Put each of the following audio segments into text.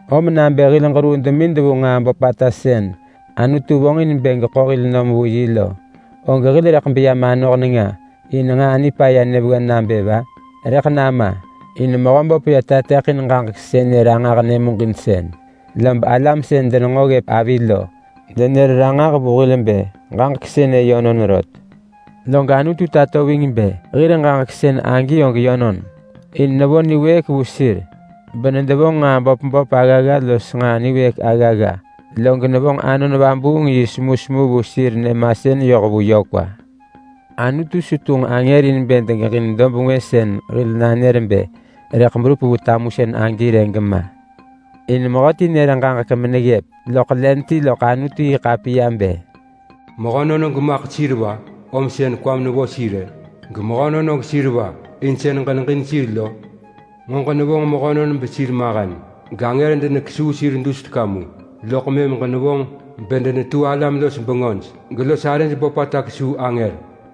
Om nabë hil ġeruu demid vu nġaa böpata sën Anutu vonġ in bë geḳo hil nom vu yi lo, og hil rëḳ beya manoh nenga in nġaa nipaya nyëvewen nabë va? Rëḳ nama! In Mehöböp yö tateḳin ġaġek semusën sënë ranġah nyëmuġinsën, lob alam sën denenġo ggëp avi lo denër ranġah vu hil bë ġaġek sënë yönon rot. Log Anutu tato ving bë hir ġaġek sën agi og yönon. In nevo niwëëk vu sir bedenevonġ nġaa böp böp aggagga los nġaa niwëëk aggagga. Log nevonġ Anon Vabuung yi semusemu vu sir nyëmasën yoh vu yö kwa. Anutu su tunġ angër in bë degeġin dob ngwë sën hil nanër bë rëḳ berup vu tamusën agi rë gema. In mehöti nër ġaġek meneggëp loḳ len ti loḳ Anutu-yi-ḳapiya bë: “Mehönon og maḳ sir va, om sën kwam nevo sir-ë? Gemehönon og sir va, in sën ġeneġin sir lo? Nġo ġenevonġ mehönon besir mahen, gangër denekesuu sir dus teka mu, loḳ mëm ġenevonġ bedenetu alam-los-bengöj gelos arëj böpata kesuu angër.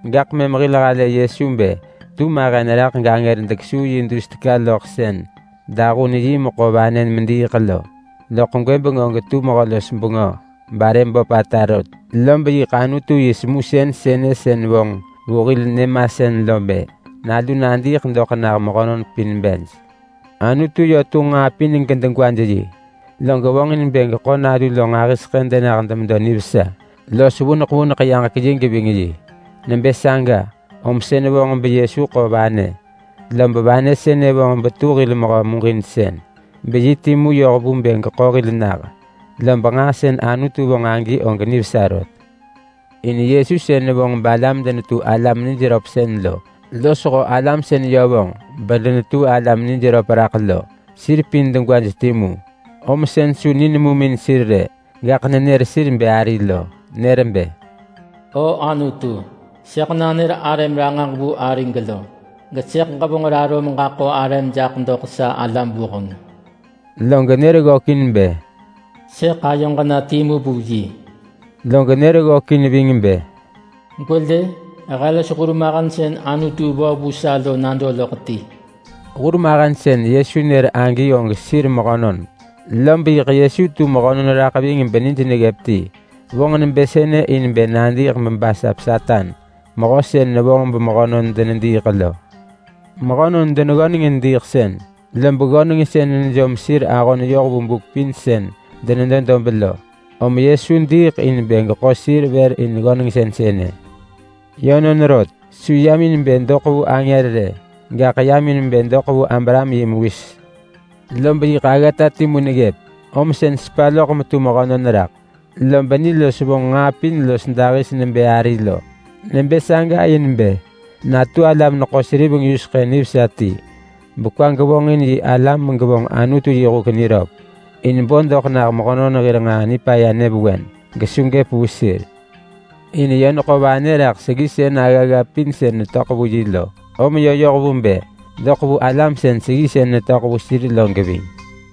Gaḳ mëm hil halë Yesu bë tu mahen raḳ gangër dekesuu yi dus teka loḳ sën dahun yi mekerë vanë mediiḳ lo, loḳ gwëbeng og tu Mehö-los-bengö barë böpata rot. Lob yiḳ Anutu yi semusën sënë sën vonġ vu hil nyëmasën lo bë: Nalu nadiiḳ doḳ nah mehönon pin bej. Anutu yö tunġ nġaa pin gedegwaj yi. Log vonġin bë geḳo nalu lo nġahiseḳë denah demedo nivesa los vuneḳ vuneḳ yaġek yi geving yi. Nebë saga, om sën vonġ beYesu ḳo vanë, lob vanë sënë vonġ betu hil mehö muġinsën beyi timu yoh vu bë geḳo hil nah. Lob nġaa sën Anutu vonġ agi og nivesa rot. In mehö sën nevonġ balam denetu alam nij röp lo losho alam sën yö vonġ bedenetu alam nij röp lo, sir pin degwaj timu. Om sën su ni nemum in sir rë, gaḳ nenër sir bë ari lo. Nër bë: “O Anutu, sëḳ nanër arëm ranġah vu arig lo. Gesëḳ ġevonġ raro meġaḳo arëm jaḳ doḳ sa alam vuheng.” Log nër ggökin bë: “Sëḳ ayoġ na timu vu yi.” Log nër ggökin ving bë: “Gwelë! He los hurmahen sën Anutu vo vu sa lo nado loḳ ti.” Hurmahen pin sir mehönon neggëp ti, lob yiḳ Yesu tu mehönon raḳ ving benij neggëp ti. Vonġ nebë sënë in bë nadiiḳ bebasap Satan, mehö sën nevonġ bemehönon denediiḳ lo. Mehönon deneggöneng in diiḳsën, lob ggönengsën nejom sir ahon yoh vu buk pin sën denedo dob lo, om Yesu diiḳ in bë geḳo sir vër in ggönengsën sënë. Yönon rot, su yam in bë doḳ vu angër rë, gaḳ yam in bë doḳ vu Abraham yi mewis. Lob yiḳ aggata timu neggëp, om sën sepa loḳ metu mehönon raḳ, lob ni los vonġ nġaa pin los dahis nebë ari lo. Nebë saga in bë natu alam-neḳo-seriveng-yuseḳë nivesa ti bekwa gevonġin yi alam megevonġ Anutu yi huk niröp, in bo doḳ nah mehönon hir nġaa nipaya nyëvewen gesu gëp vu sir. In yö neḳo vanë raḳ seggisën aggagga pin sën netöḳ vu yi lo, om yö yoh vu bë doḳ vu alam sën seggisën netöḳ vu sir lo geving.